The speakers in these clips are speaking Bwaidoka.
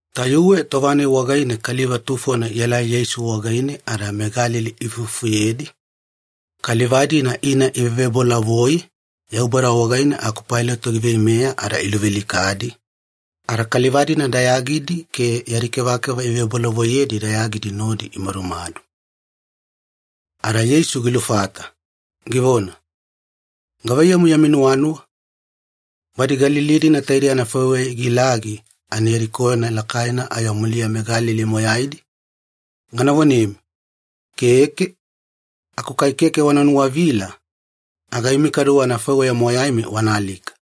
Tayuwe tova-nai wagaine kaliva tufodi ielai Yeisu wagaine ada meGalili iifufuyedi, kaliva-dina ina ivevebolavoi Yaubada wagaine aku Pailato giveimeya ada iluvealikadi, ada kaliva-dina dayagidi ke yadi kevakeva ivebolavoiyedi dayagidi nodi imadumadu. Ada Yeisu gilufata, givona, “Gavaiyamu yami nuwanuwa, badi Galili-dina taidei anafaiweya igilagi ani yadi koyona lakaina ayo muliya meGalili moyaidi? Gana vonemi, Keke! Aku kai keke wana nuwavila, aga imi kaduwe anafaiweya moyaimi wana alika.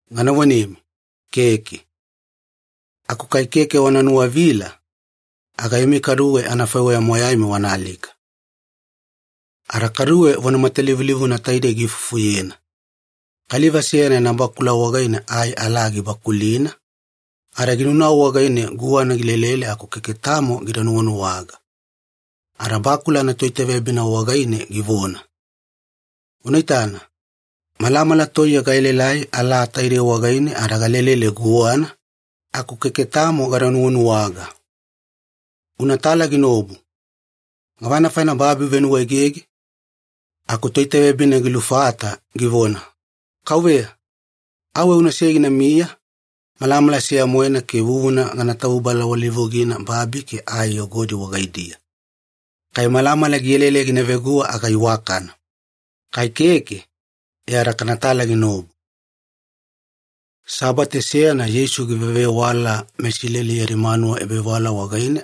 Gana vonemi, Keke! Aku kai keke wana nuwavila, aga imi kaduwe anafaiweya moyaimi wana alika-vagata.” Ada kaduwe vona matalivulivuna taidei giifufuyena, “Kaliva seyana yana bakula wagaine ai alaa gibakulina, ada ginaunau wagaine guwana gilelele aku keke tamo gida nuwanuwaga. Ada bakula anatoitaveyabina wagaine givona, ‘Una itana, malamala toiye gaelaelai alaa taidei wagaine ada galelele guwana, aku keke tamo gada nuwanuwaga. Unatala ginaobu. Gavana faina babi givenuwaegege?’ Aku toitaveyabina gilufata, givona, ‘Kauveya, auwe unasei ginamiya malamala seya-moena ke vuvuna gana tavubalawalilivugina babi ke ai yogodi wagaidiya. Kai malamala gielaelai gina veguwa aga iwakana. Kai keke, e ada kanatala ginaobu.’” Sabate seyana Yeisu givewavewala meIsileli yadi manuwa ebavewala wagaine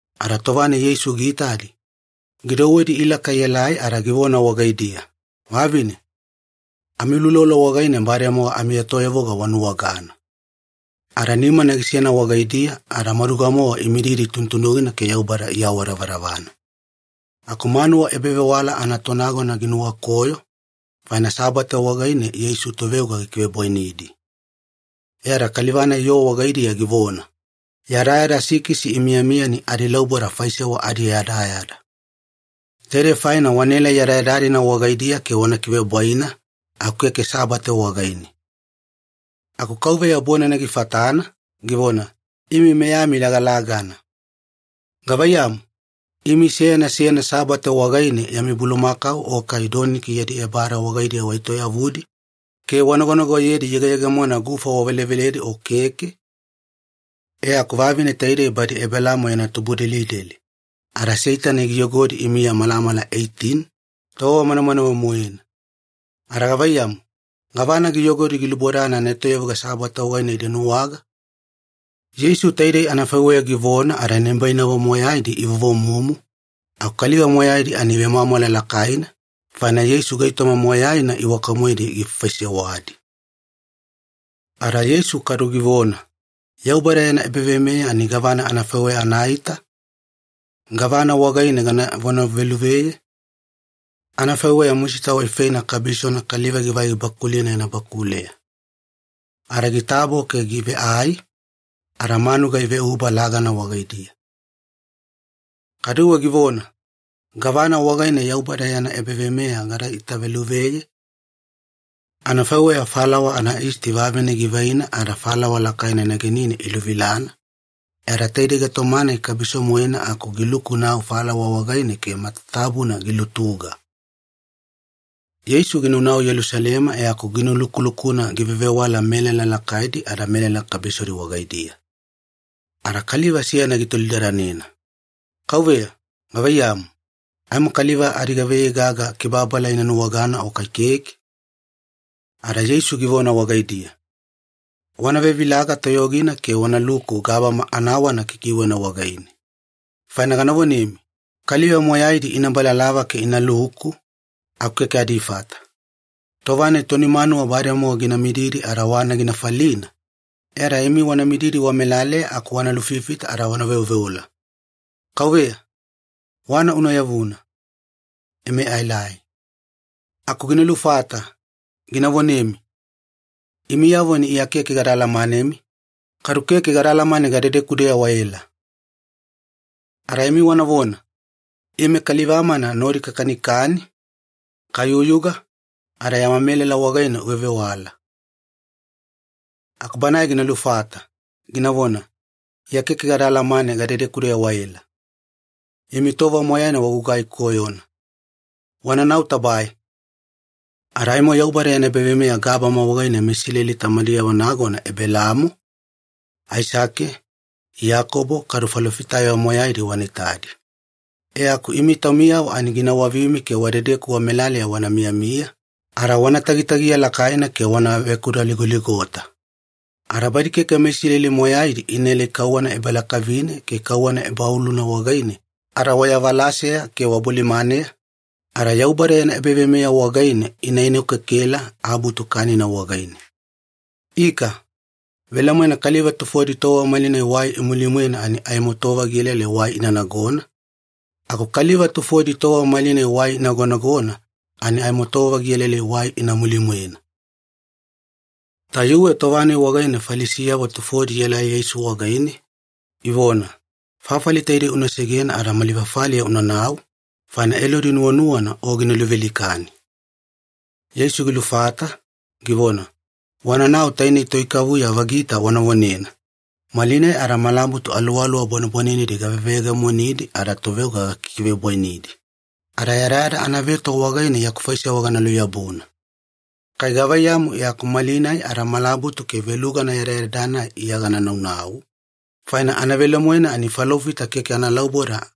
Ada tova-nai Yeisu giitadi, gidouwedi ilaka ielai ada givona wagaidiya, “Vavine, amiuloulolo wagaine bademowa amietoyavuga wanuwagana.” Ada nimana gisena wagaidiya ada maduga-mowa imididi tunutunugina ke Yaubada iawadavadavana. Aku manuwa ebavewala anatonagona ginuwakoyo, faina Sabate wagaine Yeisu toveoga gikivebwainidi. E ada kaliva-nai yoo wagaidiya givona, “Yadayada sikisi imiyamiya ani adilauboda faisewa adiyadayada. Taidei faina wanaelai yadayada-dina wagaidiya ke wana kivebwaina, aku keke Sabate wagaine.” Aku Kauveya bonana gifatana, givona, “Imi meyami lagalagana. Gavaiyamu, imi seyana seyana Sabate wagaine yami bulumakau o kai doniki yadi ebada wagaidiya waetoyavudi, ke wanagonagoyedi iyegeyegemona gufa waveleveledi o keke? E aku vavine taidei badi Ebelaamo yana tubudelideli, ada Seitani giyogodi imiya malamala eitini, tova manamanawe-moena. Ada gavaiyamu, gavana giyogodi gilubodana anaetoyavuga Sabate wagaine ida nuwagana?” Yeisu taidei anafaiweya givona ada nibainavo moyaidi ivovomumu, aku kaliva moyaidi ani ivemwamwala lakaina, faina Yeisu gaitoma moyaina iwaka-moedi gifaifaisewadi. Ada Yeisu kadu givona, “Yaubada yana ebaveimeya ani gavana anafaiweya anaita? Gavana wagaine gana vonaveluveye? Anafaiweya musita waifeina kabisona kaliva givai gibakulina yana bakuleya. Ada gitabo ke giveai, ada manuga iveuba lagana wagaidiya.” Kaduwe givona, “Gavana wagaine Yaubada yana ebaveimeya gada itaveluveye? Anafaiweya falawa anayisti vavine givaina ada falawa lakaina negenine iluvilana, e ada tainei gaitoma-nai kabiso-moena ani giluku-nau falawa wagaine ke matatabuna gilutuga.” Yeisu ginaunau Yelusalema e aku ginulukulukuna givevewala melala lakaidi ada melala kabisodi wagaidiya. Ada kaliva seyana gitolidadanena, “Kauveya gavaiyamu, aimo kaliva adigavaiyei gaga kibababala ina nuwagana o kai keke?” Ada Yeisu givona wagaidiya, “Wana vevilaga toyogina ke wanaluku gabama anawana kikiwena wagaine. Faina gana vonemi, kaliva moyaidi ina balalava ke inaluku, aku keke adifata. Tova-nai toni manuwa bademowa gina mididi ada wana gina falina, e ada imi wana mididi wamelaleya aku wana lufifita ada wana veoveola, ‘Kauveya, wana una yavuna. Ime aelai.’ “Aku gina lufata, gina vonemi, ‘Imiyavo ani Iya keke gada alamanemi, kadu keke gada alamane gadedeku-deya waela.’ “Ada imi wanavona, ‘Ime kaliva-mana nodi kakanikani, kayuyuga, ada yama melala wagaine uvevewala.’ “Aku banae gina lufata, ginavona, ‘Iya keke gada alamane gadedeku-deya waela. Imi tova moyaina wagugai koyona. Wananau tabae!’ Ada aimo Yaubada yana ebaveimeya gabama wagaine meIsileli tamadiyavo nagona Ebelaamo, Aisake, Iyakobo, kadu falofitayavo moyaidi wana itadi. E aku imi taumiyavo ani gina wavimi ke wadedeku wamelaleya wana miyamiya, ada wana tagitagiya lakaina ke wana vekudaligoligota. Ada badi keke meIsileli moyaidi inaelai kauwana ebalakavine ke kauwana ebaoluna wagaine ada wayavalaseya ke wabolimaneya, ada Yaubada yana ebaveimeya wagaine ina enokekela abutu kanina wagaine. Ika, velemoena kaliva tufodi tova malinai wai imuli-mwena ani aimo tova gielaelai wai ina nagona, aku kaliva tufodi tova malinai wai inagonagona ani aimo tova gielaelai wai ina muli-mwena.” Tayuwe tova-nai wagaine Falisiyavo tufodi ielai Yeisu wagaine, ivona, “Fafali taidei una segena ada mali fafaliya unanau, faina Elodi nuwanuwana o gina luvealikani.” Yeisu gilufata, givona, “Wananau tainei toikavuya vagita wana vonena, ‘Malinai ada malabutu aluwaluwa bwanebwanenedi gaveveyegemonidi ada toveoga gakikivebwainidi, ada yadayada anaveto wagaine yaku faisewa gana luyabuna.’ Kai gavaiyamu e aku malinai ada malabutu ke velugana yadayada-nai Iya gana naunau, faina anavelemoena ani falofita keke analauboda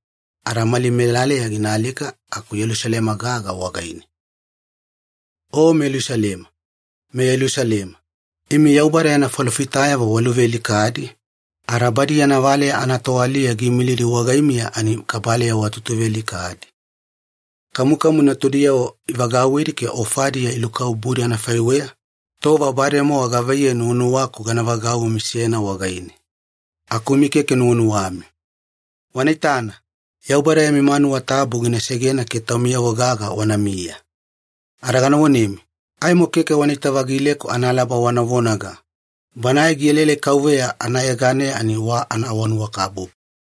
ada mali melaleya gina alika aku Yelusalema gaga wagaine. “O meYelusalema, meYelusalema, imi Yaubada yana falofitayavo waluvealikadi, ada badi yana valeya anatoaliya giimilidi wagaimiya ani kabaleya watutuvealikadi. Kamukamu natudiyavo ivagauwidi ke ofadiya ilukabubudi anafaiweya, tova bademowa gavaiyei nuwanuwaku gana vagauwimi seyana wagaine. Aku imi keke nuwanuwami. Wana itana, Yaubada yami manuwa tabu gina segena ke taumiyavo gaga wanamiya. Ada gana vonemi, aimo keke wanaita-vagileku analaba wana vonaga, ‘Banae gielaelai KAUVEYA anayeganeya ani wa anaawanuwakabubu.’”